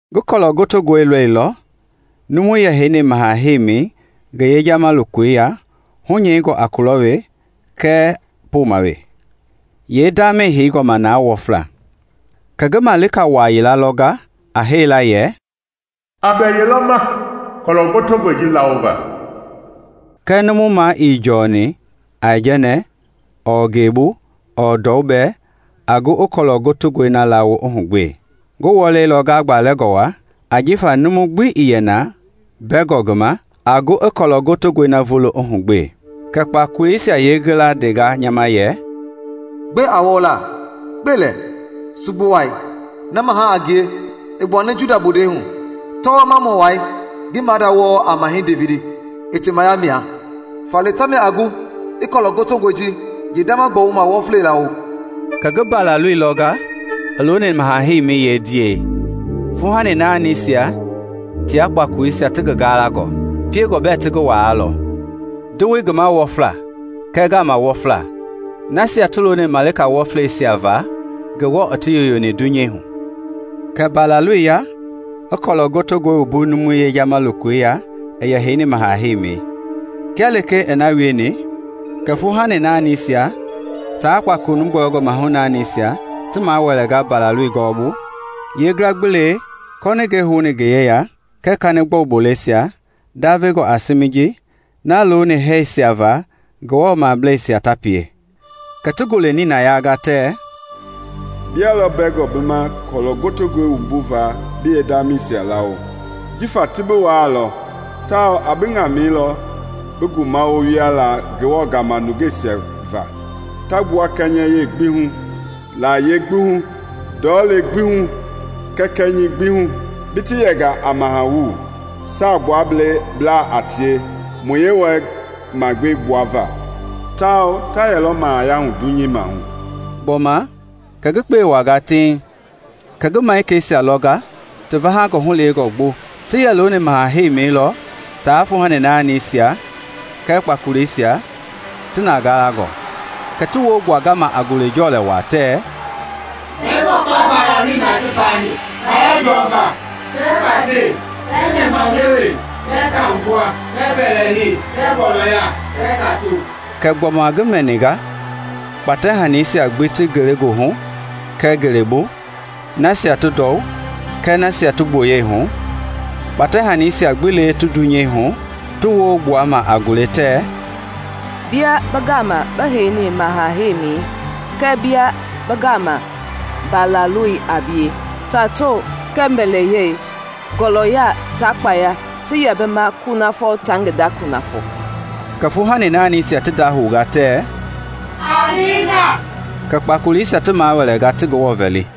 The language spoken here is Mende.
Ngi kɔlɔ gotongɔi lɔilɔ numui yɛ heini maha heimi ngi yejama lokoi ya hunyɛingɔ a kulɔ we kɛɛ poma we, yeendamei heingɔ ma na wɔfla. Kɛ ngi malika wa yila lɔnga a hee la yɛ, “A bɛ yelɔ ma kɔlɔ gotongɔi ji laawo va?” Kɛɛ numu ma ii jɔni aijɛnɛ ɔɔ ngelebu ɔɔ ndɔu bɛɛ aa gu i kɔlɔ gotongɔi na laawo i hugbe. Ngi wɔɛilɔ ngagbalɛngɔ wa ajifa numu gbii yɛ na bɛngɔ ngi ma a gu i kɔlɔ gotongɔi na vulo i hugbe. Kɛ kpakoleisia yeeyilayee ndenga nya ma yɛ, “Gbe a wɔɔla. Kpe lɛ! Sugbu Wai, na maha a ngie i gbuani Juda bondei hu, tɔwɔmamɔ wai ngi maada wɔɔ a mahɛi Devidi, i temaya mɛa. Faale tamia a gu i kɔlɔ gotongɔi ji yeendama gbɔwuma wɔflei laawo.” Kɛ ngi Mbalaloi lɔnga i looni maha-heimɛi yee ndiahu, fuuhani naanisia tia kpakoleisia ti ngi galangɔ, piengɔ bɛ ti ngi waalɔ, ndowoi ngi ma wɔfla kɛɛ gaama wɔfla, nasia ti looni ngafa wɔfleisia va Ngewɔ i ti yoyoni dunyei hu. Kɛ Mbalaloi ya i kɔlɔ gotongɔi wumbu numui yejama lokoi ya i heini maha heimi. Kia lee i na wieni, kɛ fuuhani naanisia tia kpakolo nu gbɔyɔngɔ mahu naanisia ti mawɛlɛnga Mbalaloi gɔɔbu, yeengila gbi lee kɔningɛi houni ngi yeya kɛɛ kanigbɔu boleisia ndavengɔ a siimijii, na looni hɛɛsia va Ngewɔ mableisia ta pie. Kɛ ti gule nina yaanga, tɛ: “Bia lɔ bɛngɔ bi ma kɔlɔ gotongɔi wumbuva bi yee ndamɛisia laawo. Jifa ti bi waalɔ tawao a bi ŋamɛi lɔ bi ngumawo wiala Ngewɔ gama nungeisia va ta gbua kɛnyɛ yie gbi hu, layie gbi hu, ndɔlei gbi hu, kɛɛ kɛnyɛi gbi hu. Bi ti yɛnga a mahawu saagbuablaa a tie mu Yewɔɛi magbee gbuava, tawao ta yɛlɔ mahayahu dunyei maahu.” Gbɔma kɛ ngi kpeei wuaanga tiiŋ, kɛ ngi malikeisia lɔnga ti vahangɔ hulewengɔ gbo! Ti yɛ looni maha heimi lɔ taa fuuhani naanisia, kɛɛ kpakoleisia ti na galangɔ, Kɛ ti woo gbuanga ma a gule jɔɛlɛ wa tɛ: “Bɛngɔ kpa Mbalaloi ma ti paani, kpaya jɔva, kɛɛ kpatɛi, kɛɛ nɛmahulewe, kɛɛ kahu gbua, kɛɛ mbɛlɛhei, kɛɛ gɔlɔya, kɛɛ tato!” Kɛ gbɔma ngi mɛiga kpatɛ hani gbi lee ti ngelegoohu kɛɛ ngelebu, nasia ti ndɔu kɛɛ nasia ti gboyei hu, kpatɛ hanisia gbi lee ti dunyei hu, ti woo gbuama a gule tɛ: “Bia bi gama bi heini maha-heimɛi kɛɛ bia bɛɛ gama Mbalaloi a bie, tato kɛɛ mbɛlɛhei, gɔlɔya taa kpaya ti yɛ bi ma kunafɔ taa ngi da kunafɔ!” Kɛ fuuhani naanisia ti ndahounga tɛ, “Amiina!” Kɛ kpakoleisia ti mawɛlɛnga ti Ngewɔ vɛli.